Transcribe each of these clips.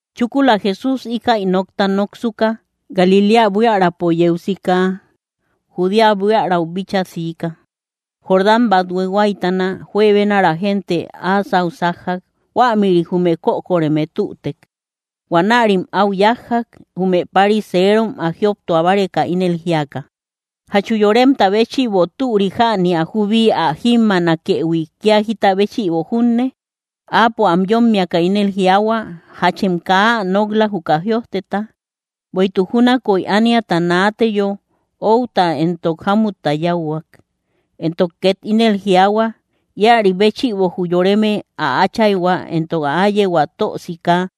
Chúkula Jesús íkäi nokta noksuka, Galiléa buiärapo yeu sika, Judea buiärau bíchaa siika, Jordán bathue huáytana. Juebenara gente áa sáu sájjak. Huämïri jume kökoreme tütek. Huanärim áu yájjak, jume pariserom, ä jioptua báreka, ínel jíaka: —¿Jachu yoremta béchïbo türi jäni ä jubi ä jímmaanakëhui, kía jita béchïbo junne? Áapo am yómmiaka ínel jiaahua: —¿Jachem kaa ä nok‑la, juka jïojteta? Bueïtuk júnakoy ániata naateyo, “outa entok jámutta yáuhuak”. Entok két ínel jiaahua: “Íäri béchïbo jü yoreme ä áchayhua entok ä áyehua tösika,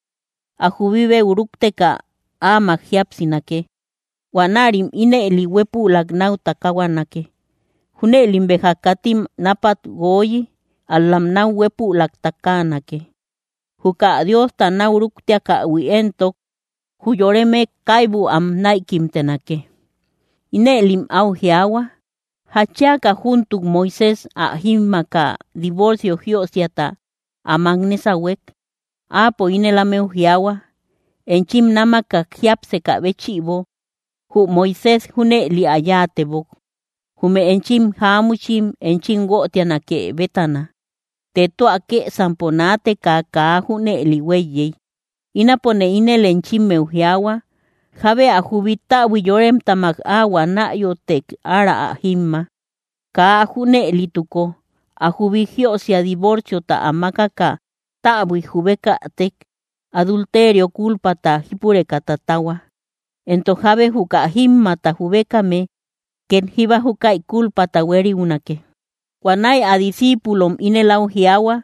ä jubibeu rúkteka áamak jíapsinake. Huanärim ínëli huépülak náu takahuanake.” Júnëlim béja katim náapat guooyi, ál‑lam náu huépülak takaanake. Juka Diosta náu rúktiakähui éntok, jü yoreme kaibu am näikimtenake. Inëlim áu jiaahua: —¿Jatchiaka júntuk Moisés ä jímmaaka divorcio jiösiata ä mák nésahuek? Áapo ínel ámeu jiaahua: —Enchim námakak jiápsekä béchïbo jü Moisés junëli ä yáatebok, jume enchim jáamuchim enchim guötianake bétana. Të tua kësampo naateka kaa junëli huéiyey. Ínapone ínel enchimmeu jiaahua, jábe ä jubi täbui yoremtamak áhuä náyotek ára ä jímma. Kaa ä junëlituko, ä jubi jiösia divorciota ä mákaka täbuik jubekätek, adulterio kúlpata jípureka tatahua; entok jábe juka jímmata jubekame két jíba júkäi kúlpata huériunake. Huanäi ä discíipulom ínel áu jiaahua: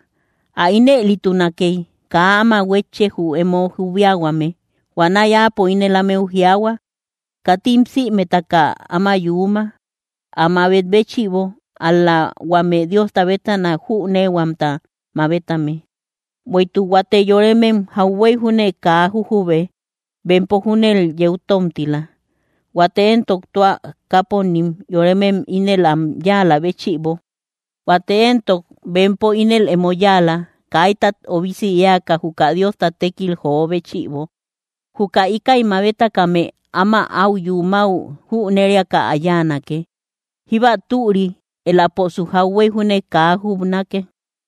—Ä ínëlitunakey, kaa áma huétche, jü emo jubiahuame. Huanäi Áapo ínel ámeu jiaahua: —Katim sïmetaka áma yuuma, ä mabet béchïbo, ál‑la huame Diosta bétana jüneehuamta mabetame. Bueïtuk huate yoremem jauhuey júne kaa jujube; bempo júnel yeu tómtila. Huate entok tua káponim, yoremem ínel am yáalä béchïbo; huate entok bempo ínel emo yáala, kaitat obisi éaka, juka Diosta tékil joo béchïbo. Juka íkäi mabetakame áma áu yumäu jüneriaka ä yáanake; jíba türi éläposu jauhuey júne kaa jubnake.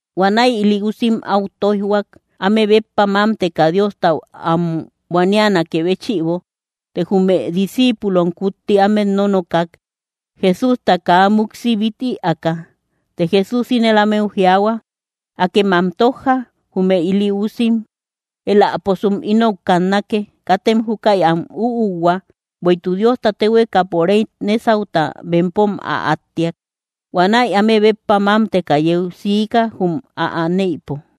Huanäi ili usim áu tóijhuak, áme béppa mámteka Diostau am buanianakë béchïbo; të jume discíipulom kutti ámet nónokak, Jesústa kaa múksi bít ïaaka. Të Jesús ínel ámeu jiaahua: —Akem am tójja Jume ili usim éläposum ínou kannake. Katem júkäi am úuhua, bueïtuk Diosta téhuekapo réy nésauta, bempom ä áttiak. Huanäi áme béppa mámteka yeu siika, jum ä aneïpo.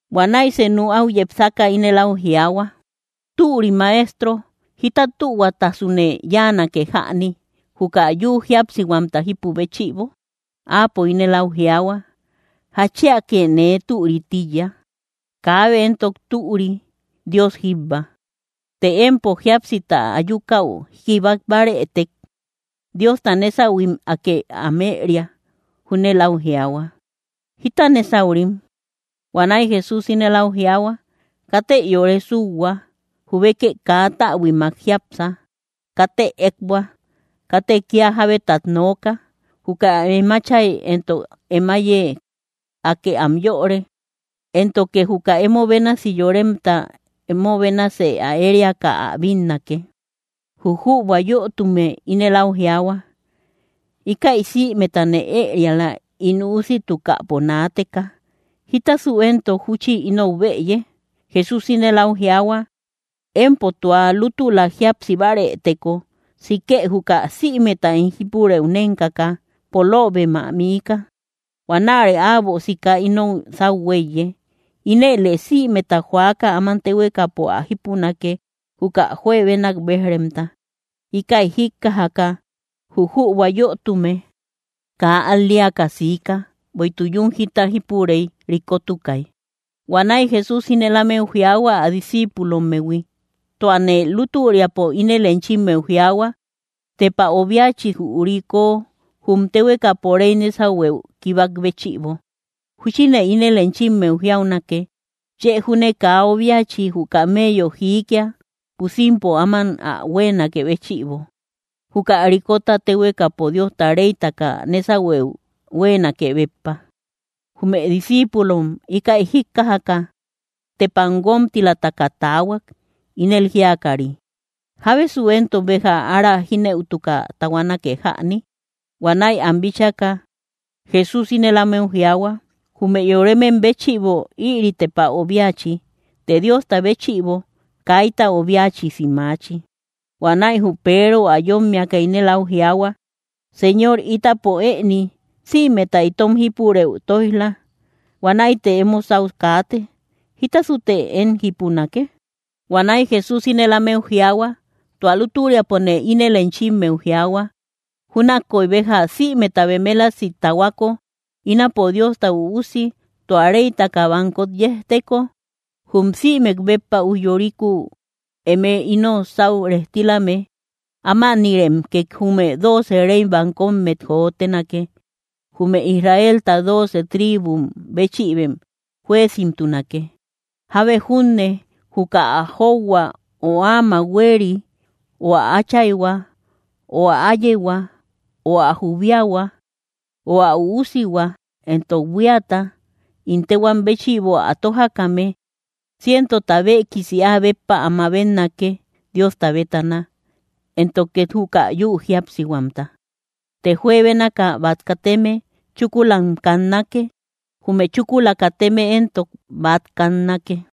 Huanäi senu áu yepsaka ínel áu jiaahua: —Türi Maestro, ¿jita tühuatasune yáanake jäni, juka yü jíapsihuamta jípu béchïbo? Áapo ínel áu jiaahua: —¿Jatchiake nee türï tíiya? Kaabe éntok türi, Dios jíbba. Të empo jíapsita ayukäu kibak bárëtek, Diosta nésahuim, Akë am ëeria. Júnel áu jiaahua: —¿Jíta nésaurim? Huanäi Jesús ínel áu jiaahua: —Katë yore súuhua. Jubekë kaa täbuimak jiápsa. Katë ékbua. Katë kía jábetat nooka. Juka em átchay entok em áiye, Akë am yöre; éntoke juka emo bénasi yoremta emo bénasë ä ériaka ä bínnake. Jü jübua yötume ínel áu jiaahua: —Íkäi sïmetane ëeriala ín usitukäpo naateka. ¿Jita éntok júchi ínou bëye? Jesús ínel áu jiaahua: —Empo tua lútula jíapsi bárëteko, sikë juka sïmeta em jípurëu nénkaka, poloobem ä miika. Huanäre äbo sika ino sáu huéiye. Inëlë sïmeta joaka, áman téhuekapo ä jípunake, juka juebenak béj‑remta. Íkäi jíkkajaka jü jübua yötume, kaa al‑leaka siika; bueïtuk yún jita jipurey, rikotukay. Huanäi Jesús ínel ámeu jiaahua, ä discíipulommehui: —Tuane lútüriapo ínel enchimmeu jiaahua, tepa obiachi jü riko jum téhuekapo réy nésahueu kibak béchïbo. Júchine ínel enchimmeu jiaunake, chë júne kaa obiachi jü kameyo jiikia pusimpo áman ä huéenakë béchïbo, juka rikota téhuekapo Diosta réytaka nésahueu huéenake béppa. Jume discíipulom íkäi jíkkajaka, tepam guómtilataka taahuak, ínel jíakari: —¿Jábesu éntok béja ára jínëutaka tahuanake jäni? Huanäi ám bíchaka Jesús ínel ámeu jiaahua: —Jume yoremem béchïbo ïri tepa obiachi; të Diosta béchïbo kaita obiachisi maachi. Huanäi jü Peero ä yómmiaka, ínel áu jiaahua: —Señor ítapo ëni, sïmeta itom jípurëu tóij‑la; huanäite emo sáu kaate. ¿Jítasute, én, jípunake? Huanäi Jesús ínel ámeu jiaahua: —Tua lútüriapone ínel enchimmeu jiaahua, júnakoy béja sïmeta bemelasi tahuako, ínapo Diosta Üusi tua réytaka bankot yejteko jum sïmek béppa ujyorikuu, eme ino sáu rejtilame, ámanïrem két jume dooce rey bankommet jotenake. Jume Israelta dooce tribum béchïbem jueezimtunake. Jábe junne juka ä jóuhua, ö áamak huéeri, ö ä áchayhua, ö ä áyehua, ö ä jubiahua, ö ä usihua entok buíata, ín téhuam béchïbo ä tójakame, cientota béekisi áa béppa ä mabetnake, Diosta bétana, éntok két juka yü jíapsihuamta. Të juebénaka bát kateme chúkulam kannake; jume chúkula kateme éntok bát kannake.